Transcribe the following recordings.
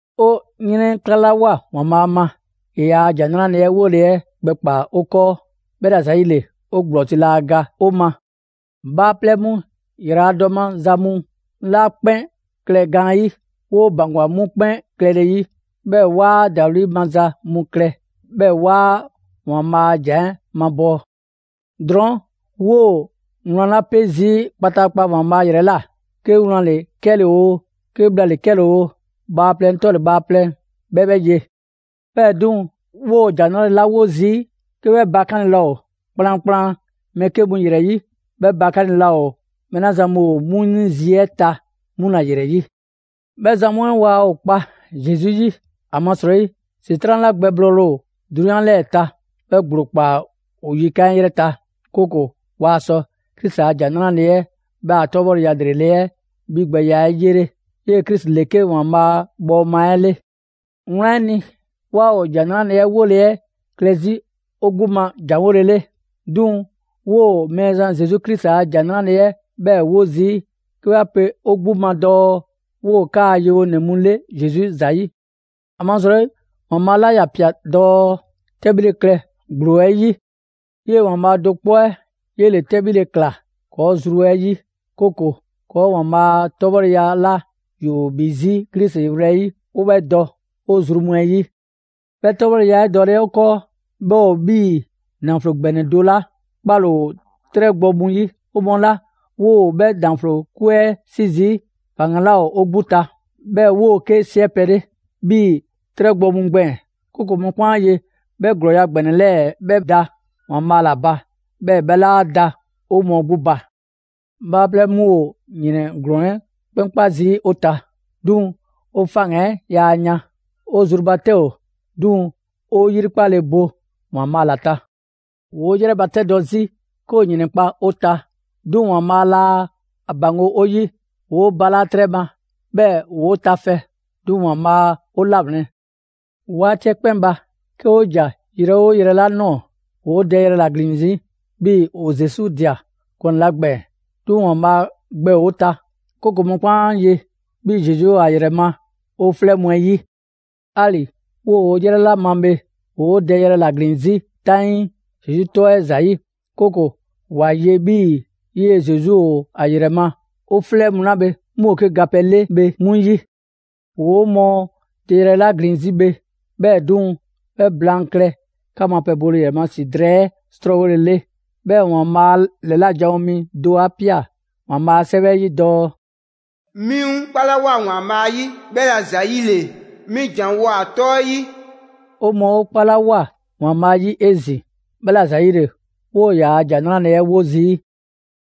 'O 'yrɛnklalawoa ‑Waanbhaa' ma, ‑e ‑yaa' ‑Jan 'Nrale‑ 'ɛ 'wole‑ 'ɛ gbɛkpaa‑ 'o 'kɔɔ, 'bhɛla‑ ‑zayile, 'o ‑gblɔzi' laa ga 'o ma. Bhaaplɛŋ mu ‑yraladɔ maza mu 'la 'kpɛn klɛ gaanyi', 'woo ‑baŋgwa 'mu 'kpɛn klɛle 'yi. 'Bhɛɛ‑ 'waa ‑dawli' maza mu klɛ, 'bhɛɛ‑ 'waa ‑Waanbhaa' a ‑Jan 'ɛ mabɔɔ. Drɔɔn' 'woo‑ wlan 'la 'pe zii' kpataakpa ‑Waanbhaa' ‑yrɛ ꞊la, 'ke wlan ‑le 'kɛle‑ oo, 'ke bhla ‑le 'kɛle‑ oo, bhaaplɛŋ 'tɔle‑ bhaaplɛŋ 'bhɛ 'bhɛ ye. 'Bhɛɛ‑ 'duŋ‑, 'woo‑ ‑Jan 'Nrale‑ 'la 'wo zii', 'ke 'bhɛ bakanle laa ‑o kplankplan mɛɛ 'ke mu ‑yrɛ 'yi; 'bhɛ bakanle laa ‑o mɛɛ 'la zan mu ‑o 'mu 'ni zi 'ɛ ta 'mu ‑la ‑yrɛ 'yi. 'Bhɛ zan mu 'ɛ waa ‑o kpa Zesu 'yi, ‑amasrɔyi ‑Setran' 'la gbɛblɔɔle ‑o 'drunyan 'lɛɛ‑ ta, 'bhɛ ‑gblo ꞊kpaa ‑o yikan' 'ɛ 'yrɛ ta; 'kooko‑ waa sɔ Krisi a ‑Jan 'Nrale‑ 'ɛ 'bhɛ a 'tɔbhɔleya ‑lrele' 'ɛ 'bhigbɛya 'ɛ 'yele. 'Yee‑ Krisi ‑le 'ke ‑Waanbhaa' bhɔɔma 'ɛ 'le. Wlan 'ɛ ni, 'waa ‑o ‑Jan 'Nrale‑ 'ɛ 'wole‑ 'ɛ klɛ 'zi 'o 'gbu ma janwolele. 'Duŋ‑ 'woo‑ Mɛɛzan Zesu Krisi a ‑Jan 'ɛ 'bhɛɛ‑ 'wo zii', 'ke 'wa pe 'o 'gbu ma dɔɔ 'woo‑ 'kaa‑ yewonɛ mu 'le Zesu ‑zayi'. ‑Amasrɔyi ‑Waanbhaa' 'la ‑ya ꞊pia dɔɔ: «'Tɛbhile klɛ ‑gblo 'ɛ 'yi!» 'Yee‑ ‑Waanbhaa' do 'kpɔ 'ɛ 'yele‑ 'tɛbhile ꞊klaa ‑kɔɔ' zru 'ɛ 'yi, 'kooko‑ ‑Waanbhaa' a 'tɔbhɔleya 'la ‑yoo ‑bhi 'zi Krisi wlɛyi', 'o 'bhɛ dɔ 'o zru mu 'ɛ 'yi. 'Bhɛ 'tɔbhɔleya 'ɛ dɔle 'ɛ 'o 'kɔɔ 'bhɛ ‑o 'bhii‑ ‑naflo ‑gbɛnɛ do 'la 'kpale‑ ‑o 'trɛ gbɔ mu 'yi. 'O mɔɔ 'la 'woo‑ 'bhɛ ‑naflo 'kwe 'ɛ 'si zii', faŋgan‑ 'laa ‑o 'o 'gbu ta, 'bhɛɛ‑ 'woo‑ 'ke 'siɛpɛ‑ 'le 'bhii‑ 'trɛ gbɔ mu gbɛɛn‑; 'kooko‑ mɔkpɛn' 'a ye 'bhii‑ 'bhɛ ‑glɔɔya' ‑gbɛnɛ 'lɛɛ‑ 'bhɛ da ‑Waanbhaa' ‑la ba, 'bhɛɛ‑ 'bhɛ 'laa da 'o mɔɔ 'gbu ba. Bhaaplɛŋ mu ‑o ‑yrɛn ‑glɔɔn 'ɛ 'kpɛn kpa zii' 'o ta; 'duŋ‑ 'o faŋgan‑ 'ɛ yaa yan. 'O zru ba 'tɛ ‑o; 'duŋ‑ 'o 'yrikpale bo ‑Waanbhaa' ‑la ta. ‑Woo' 'yrɛbatɛdɔ 'zi 'ke ‑o ‑yrɛnkpa' 'o ta; 'duŋ‑ ‑Waanbhaa' laa 'a ‑baŋgo' 'o 'yi. ‑Woo' balaa' 'trɛ ma, 'bhɛɛ‑ ‑woo' tafɛ; 'duŋ‑ ‑Waanbhaa 'o 'lawlɛn‑. 'Waati 'ɛ 'kpɛn ba, 'ke 'o ‑ja yrɛ 'oo yrɛ 'la ꞊nɔɔ, ‑woo' dɛyrɛ ‑la ‑glin 'zi 'bhii‑ ‑o Zesu ꞊dia gɔnɛ 'la gbɛɛn‑. 'Duŋ‑ ‑Waanbhaa' gbɛ ‑o ta, 'kooko‑ mɔkpɛn' 'a ye 'bhii‑ Zesu ‑o ‑a ‑yrɛ ma 'o 'flɛ mu 'ɛ 'yi. 'Ali‑ 'woo‑ 'yrɛ 'la ma bhe, ‑woo 'o dɛyrɛ ‑la ‑glin 'zi 'taŋii Zesu 'tɔ 'ɛ ‑zayi'; 'kooko‑ ‑wa ye 'bhii‑ 'yee‑ Zesu ‑o ‑a ‑yrɛ ma 'o 'flɛ mu 'la 'mu ‑o 'ke gapɛ 'le bhe 'mu 'yi. ‑Woo 'o mɔɔ dɛyrɛ 'la ‑glin 'zi bhe, 'bhɛɛ‑ 'duŋ‑, 'bhɛ blaan klɛ 'ka mu a pɛ bole ‑yrɛ ma ‑si drɛɛ 'ɛ 'srɔɔwolele. 'Bhɛɛ‑ ‑Waanbhaa' ‑lɛla' janwo mi 'ɛ do 'a pia ‑Waanbhaa' a 'Sɛwɛ 'ɛ 'yi dɔɔ: «'Mi 'ŋ 'kpalawoa ‑Waanbhaa' 'yi, 'bhɛla‑ ‑zayile 'mi ‑janwoa ‑a 'tɔ 'ɛ 'yi.» 'O mɔɔ 'o 'kpalawoa ‑Waanbhaa' 'yi 'ezin‑, 'bhɛla‑ ‑zayile 'woo‑ ‑yaa' ‑Jan 'Nrale‑ 'ɛ 'wo zii'.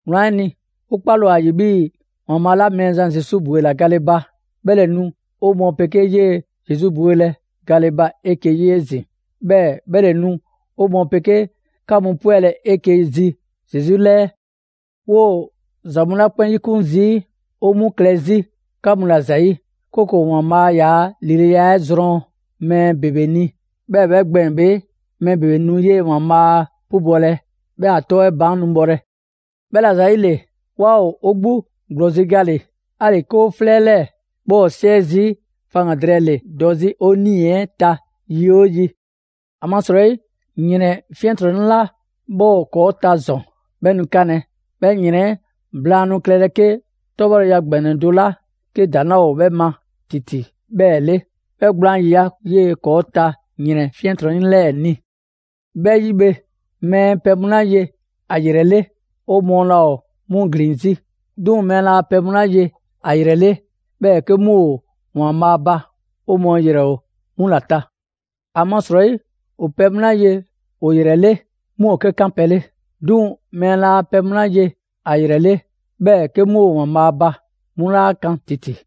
Wlan 'ɛ ni, 'o 'kpale‑ ‑o ‑a ‑yi 'bhii‑ ‑Waanbhaa' 'la Mɛɛzan Zesu ‑bwela gale ba, 'bhɛ ‑le nu 'o mɔɔ 'pegee 'yee‑ Zesu bwelɛ gale ba 'eke‑ 'yi 'ezin‑, 'bhɛɛ‑ 'bhɛ ‑le nu 'o mɔɔ 'pegee 'ka mu 'pwɛlɛ‑ 'eke‑ zi Zesu 'lɛɛ. 'Woo‑ ‑za mu 'la 'kpɛn 'yikun zii', 'o 'mu klɛ 'zi 'ka mu ‑la ‑zayi', 'kooko‑ ‑Waanbhaa' ‑yaa' ‑lileya 'ɛ zrɔn mɛɛ ‑bebe ni, 'bhɛɛ‑ 'bhɛ gbɛɛn‑ bhe, mɛɛ ‑bebe nu 'yee‑ ‑Waanbhaa' 'pubɔlɛ, 'bhɛɛ‑ ‑a 'tɔ 'ɛ baan' nu bhɔlɛ. 'Bhɛla‑ ‑zayile, 'waa ‑o 'o 'gbu ‑gblɔzi' gale‑. 'Ali‑ 'ke 'o 'flɛ 'lɛɛ‑ 'bhɛ ‑o 'siɛ zii', faŋgan‑ drɛɛ ‑le dɔ 'zi 'o 'nii‑ 'ɛ ta yi 'oo yi. ‑Amasrɔyi ‑yrɛn 'fiɛntrɔnnɛ 'la 'bhɛ ‑o ‑kɔɔ' ta ‑zɔn, 'bhɛ nu 'kanlɛ‑. 'Bhɛ ‑yrɛn 'ɛ blaan' nu klɛlɛ 'ke 'tɔbhɔleya ‑gbɛnɛ do 'la 'ke ‑daŋ' 'laa ‑o 'bhɛ ma ‑titi 'bhɛɛ‑ 'le; 'bhɛ gblaan ‑yiya' 'yee‑ ‑kɔɔ' ta ‑yrɛn 'fiɛntrɔnnɛ 'lɛɛ‑ ni. 'Bhɛ 'yi bhe, mɛɛ pɛ mu 'la ye ‑a ‑yrɛ 'le, 'o mɔɔ laa ‑o 'mu ‑glin 'zi. 'Duŋ‑ mɛɛ laa pɛ mu 'la ye ‑a ‑yrɛ 'le, 'bhɛɛ‑ 'ke 'mu ‑o ‑Waanbhaa' ba, 'o mɔɔ ‑yrɛ ‑o 'mu ‑la ta. ‑Amasrɔyi ‑o pɛ mu 'la ye ‑o ‑yrɛ 'le, 'mu ‑o 'ke 'kanpɛ‑ 'le; 'duŋ‑ mɛɛ laa pɛ mu 'la ye ‑a ‑yrɛ 'le, 'bhɛɛ‑ 'ke 'mu ‑o ‑Waanbhaa' ba, 'mu 'laa kan ‑titi.